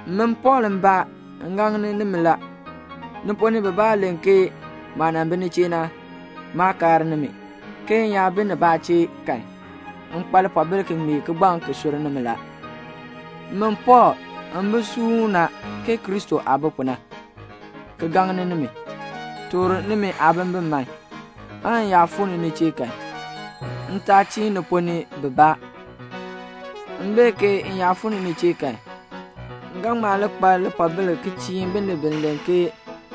Min Pɔɔl mbaa, m gaŋni nimi la. Ni ponn ni bibaa len ke maah nan bi ni chee na, maa kaar nimi, ke m yaa bi nibaa chee kan, m kpa lipoobil ki ŋmee kigbaŋ ki sur nimi la. Min Pɔɔl, m bi suuna ke Kristo aah bi pu na, ki gaŋni nimi, toor nimi aabimbin man, aan m yaa fuu ni ni chee kan, m taa chiin ni ponn ni bibaa. M bee ke m yaa fuu ni ni chee kan, m ga ŋma li kpa lipoobil ki chiin binib bi len ke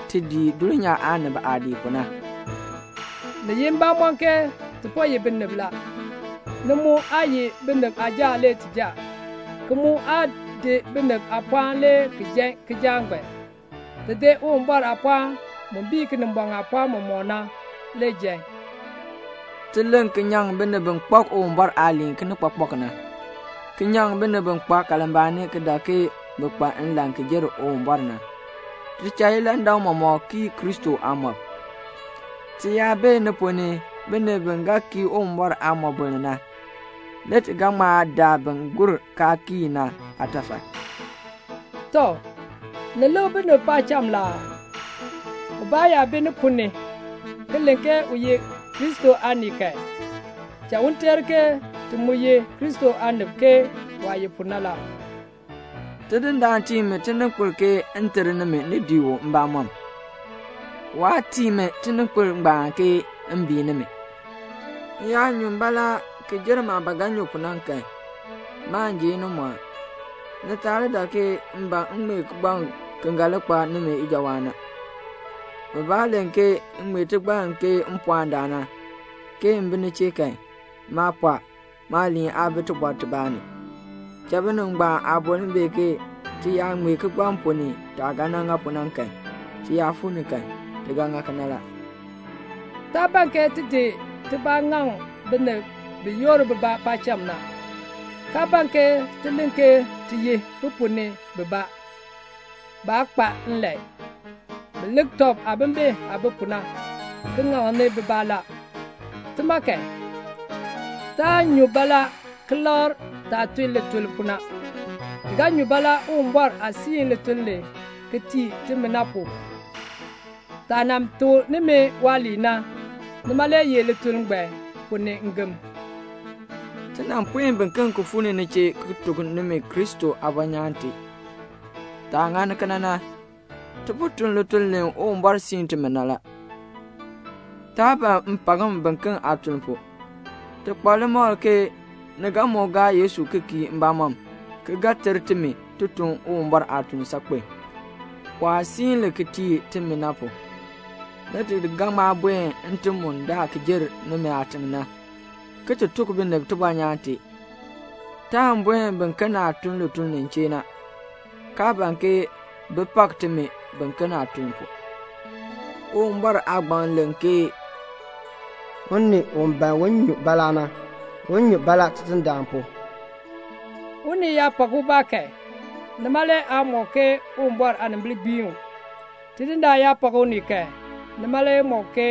ti dii dulnyaa aanib aah dii pu na. Ni ye mbamɔn ke ti po ye binib la. Ni mu aa ye binib aajaak le ti jaa, ki mu aa di binib aapɔɔn le ki jaa kijaak ngbaan. Ti di Uwumbɔr aapɔɔn mu bii Kinimbɔŋ aapɔɔn mɔmɔk na. Ti len ki nyaŋ binib bi kpak Uwumbɔr aaliin kinikpakpak na, ki nyaŋ binib bi kpa kalmbaani ki dak ke bi kpa nlan ki jer Uwumbɔr na. Ti cha ilandak mɔmɔk kii Kristo aamɔb. Ti yaa bee ni ponn ni binib bi ga kii Uwumbɔr aamɔboln na, le ti ga ŋma daa bin gur kaa kii na aatafal. Tɔ, ni lik binib paacham la aa? Ubaa yaa bi ni ponn ni ki len ke u ye Kristo aanii kan, cha u teer ke ti mu ye Kristo aanib ke waah ye pu na la. Tidindaan tii mi tininkpil ke m ter nimi ni dii u mbamɔm, waa tii mi tininkpil ngbaan ke m bii nimi. M yaa nyun baalaa ki jer maah ba ga nyu pu na kan, maan ji inimɔɔn. Ni taa li dak ke m ban m ŋmee kigbaŋ ki ga li kpa nimi ijawaan na. Bibaa len ke m ŋmee tigbann ke mpɔɔndaan na, ke m bi ni chee kan, maa pɔɔ, maaliin aa bi tibɔr tibaa ni. Cha binib ngbaan aaboln bee ke ti yaa ŋmee kigbaŋ ponn ni taah ga ŋa pu na kan, ti yaa fuu ni kan, ti ga ŋa kena la. Taa ban ke ti di tibaa ŋaŋ binib bi yoor bibaa paacham na, kaa ban ke ti len ke ti ye bi ponn ni bibaa. Baa kpa nlan. Bi lik tɔb aabimbin aah bi pu na, ki ŋaŋni bibaa la. Tima kan, taan nyu baalaa ki lakr taah tun lituln pu na. Ti ga nyu baalaa Uwumbɔr aah siin lituln li ki tii timi na pu. Taah nan tuk nimi waaliin na, nima le ye lituln ngbaan ponn ni ngem. Ti nan puen biken ki fuu ni ni chee ki tuk nimi Kristo aabɔnyaan tee. Taah ŋani kena na, ti po tun lituln li Uwumbɔr siin timi na la. Taa ban mpakm biken aatuln pu. Ti kpa limakl ke ni ga moo gaa Yesu ki kii mbamɔm, ki ga ter timi ti tun Uwumbɔr aatuln saakpen, waah siin li ki tii timi na pu. Le ti ga ŋma buen ntim mu daa ki jer nimi aatiŋ na, ki ti tuk binib tibɔnyaan tee. Taan buen biken aah tun lituln nin chee na, kaa ban ke bi pak timi biken aatuln pu. Uwumbɔr aagbaŋ len ke "Unii u ban un nyu baalaa na, un nyu baalaa Tidindaan pu." Unii yaa pak ubaa kan, nima le aa mɔk ke Uwumbɔr aanimbil gbiin u. Tidindaan yaa pak unii kan, nima le mɔk ke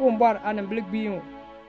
Uwumbɔr aanimbil gbiin u.